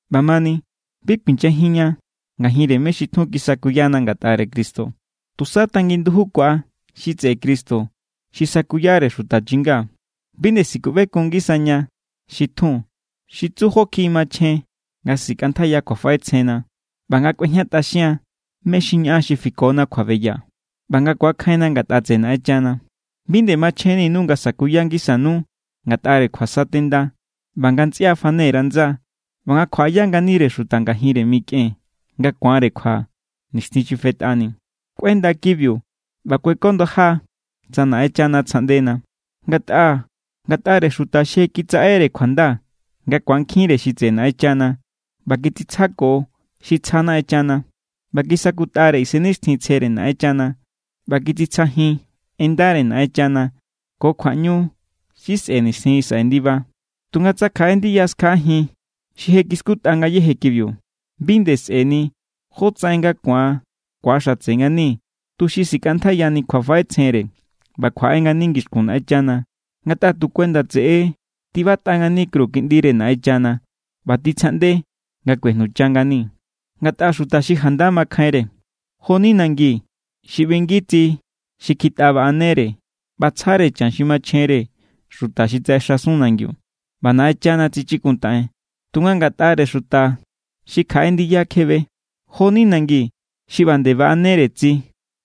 ꞌBamani, bi kuinyajinña ngajinre mé= xi tjun kisakuyana ngatꞌare Cristo, tusa tangin ndujukua xi tseꞌe Cristo xi sakuyare xuta chinga. Bi nde sikuꞌbekun ngisaña xi tjun, xi tsu jó kjiꞌi machjen nga sikꞌantjaiya kjuafaꞌetsjenna ꞌba nga kꞌuejñatꞌaxian mé= xi ñaꞌan xi fikona kjuabeya, ꞌba nga ku̱akjainna ngatꞌa tseꞌe Naꞌenchana. Bi nde machjenninu nga sa̱kuya ngisanu ngatꞌare kjuasatenda, ꞌba nga ntsꞌia fane_ra ndsa, ꞌba nga kjuaꞌaya nganire xuta ngajinre mikꞌen nga ku̱anre kjua nixtjin xi fetꞌani. Kꞌuenda kibiu ꞌba kuekondaja, tsa Naꞌenchana tsjaꞌndena. Ngatꞌa ngatꞌare xuta xi je kitsaꞌere kjuanda nga ku̱ankjinre xi tseꞌe Naꞌenchana, ꞌba kitsitsjako xi tsjana Naꞌenchana, ꞌba kisakutꞌare Isennixtjintsjere Naꞌenchana, ꞌba kitsitsjajin en ndare Naꞌenchana ko kjuaꞌñu xi sꞌe̱ nixtjin xi saꞌe ndiba, tunga tsa kjaꞌe ndiya skjaꞌajin xi je kiskutꞌa ngayéje kibiu, bi nde sꞌe̱ni jótsaꞌen nga ku̱an ku̱axatse ngani tuxi sikꞌantjaiyani kjuafaꞌetsjenre ꞌba kjuaꞌe ngani ngixkun Naꞌenchana. Ngatꞌa tu kuenda tseꞌe= tibatꞌa ngani kru Kiꞌndire Naꞌenchana ꞌba titsjaꞌnde nga kꞌuejnucha ngani. Ngatꞌa xuta xi janda makjainre, jo=ni nangi xi ꞌbingi tsi xi kjitꞌa baꞌanere ꞌba tsjare chan xi machjenre xuta xi tsaꞌexasun nangiu, ꞌba Naꞌenchana tsichikuntaꞌen. Tunga ngatꞌare xuta xi kjaꞌe ndiya kjebe, jo=ni nangi xi ꞌba nde baꞌanere tsi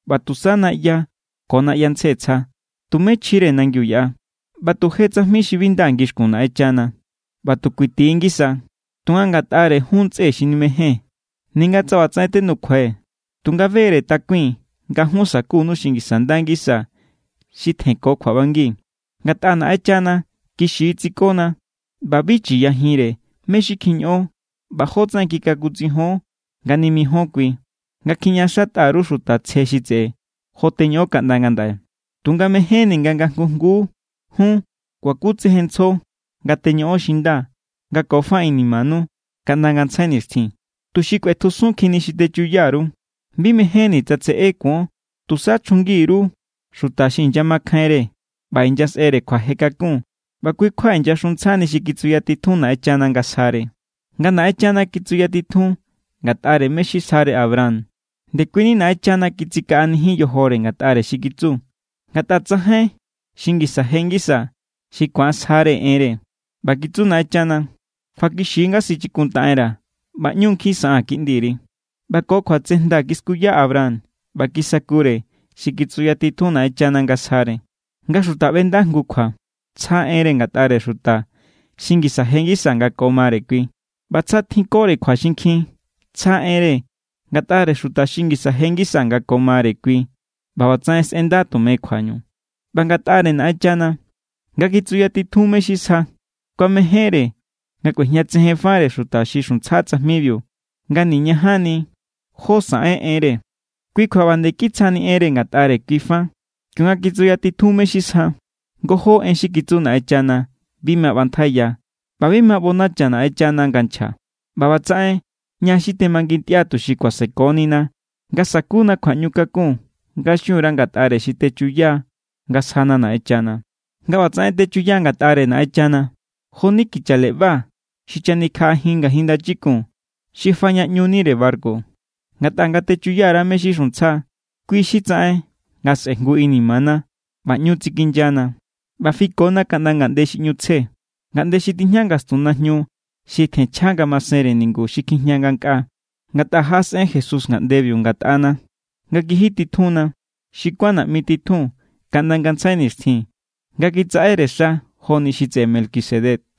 ꞌba tusa naꞌya ko naꞌyantsje tsja. Tumé chjire nangiu yaꞌa, ꞌba tu je tsajmi xi bi nda ngixkun Naꞌenchana. ꞌBa tu kuiti= ngisa. Tunga ngatꞌare jun ntsꞌe xi nimejée̱n, ninga tsa ꞌbatsaꞌen tenukjuai̱, tunga be=re takui̱n nga jun sa̱kunu xi ngisa nda ngisa, xi tjenko kjuaꞌbangi. Ngatꞌa Naꞌenchana kixi= tsikona ꞌba bi chi̱yajinre mé= xi kjiñoꞌon ꞌba jótsaꞌen kikakutsijion nga nimijíon kui, nga kjiñaꞌaxatꞌa_ru xuta tsje xi tseꞌe, jo teñoꞌon kaꞌnda ngandaꞌe. Tunga mejénni̱ nga nga jngu jnguu jun kuakutsejenntsjo nga teñoꞌon xi nda nga ko fa inimanu kaꞌnda ngantsjai nixtjin, tuxi kꞌuetjusunkjinni xi techuya_ru. Bi mejénni̱ tsa tseꞌé kuon. Tusa chjungi_ru xuta xi inyamakjainre ꞌba xi inyasꞌere kjuaje kakun ꞌba kui= kjua inyaxuntsjani xi kitsuyatitjun Naꞌenchana nga sjare. Nga Naꞌenchana kitsuyatitjun ngatꞌare mé= xi sjare Abraham, ndekuini Naꞌenchana kitsikaꞌanijin yojore ngatꞌare xi kitsu. Ngatꞌa tsajain xi ngisa je ngisa xi ku̱an sjare enre. ꞌBa kitsu Naꞌenchana: “Kjuakixi= nga sichikuntaꞌenra̱ ꞌba ꞌñu= nkjin saꞌaa̱n kiꞌndiri.” ꞌBa ko kjuatsejnda kiskuya Abraham ꞌba kisakure xi kitsuyatitjun Naꞌenchana nga sjare. Nga xuta ꞌbenda jngu kjua, tsja enre ngatꞌare xuta xi ngisa je ngisa nga ko mare kui. ꞌBa tsa tjinkore kjua xinkjin, tsja enre ngatꞌare xuta xi ngisa je ngisa nga ko mare kui ꞌba ꞌbatsaꞌen sꞌenda tume kjuañu. ꞌBa ngatꞌare Naꞌenchana, nga kitsuyatitjun mé= xi sja, kuamejénre nga kꞌuejñatsejenfare xuta xi xuntsja tsajmibiu nga niñajanni jó saꞌen enre. Kui kjua ꞌba nde kitsjani enre ngatꞌare kui fa kionga kitsuyatitjun mé= xi sja. Ngojó en xi kitsu Naꞌenchana bi ma ꞌbantjaiya, ꞌba bi ma ꞌbonacha Naꞌenchana nga nchja. ꞌBa ꞌbatsaꞌen ña xi temangintꞌia tuxi kuasekonina nga sakuna kjuaꞌñu kakun nga xun_ra ngatꞌare xi techuya nga sjana Naꞌenchana. Nga ꞌbatsaꞌen techuya ngatꞌare Naꞌenchana, jo=ni kicha leꞌba xi chanikjaꞌajin ngajin ndachikun, xi fajñaꞌñunire barku. Ngatꞌa nga techuya_ra mé= xi xuntsja, kui xi tsaꞌen nga sꞌejngu inimana ꞌba ꞌñu tsikinyana. ꞌBa fikona kaꞌnda ngaꞌnde xi ꞌñu tsje, ngaꞌnde xi tijña ngastun najñu xi tjenchja ngamasenre ningu xi kjijña ngankꞌaa. Ngatꞌa jaꞌasꞌen Jesús ngaꞌndebiu ngatꞌana nga kijititjunna. Xi kuán naꞌmi titjun kaꞌnda ngantsjai nixtjin nga kitsaꞌere xa joni xi tseꞌe Melquisedec.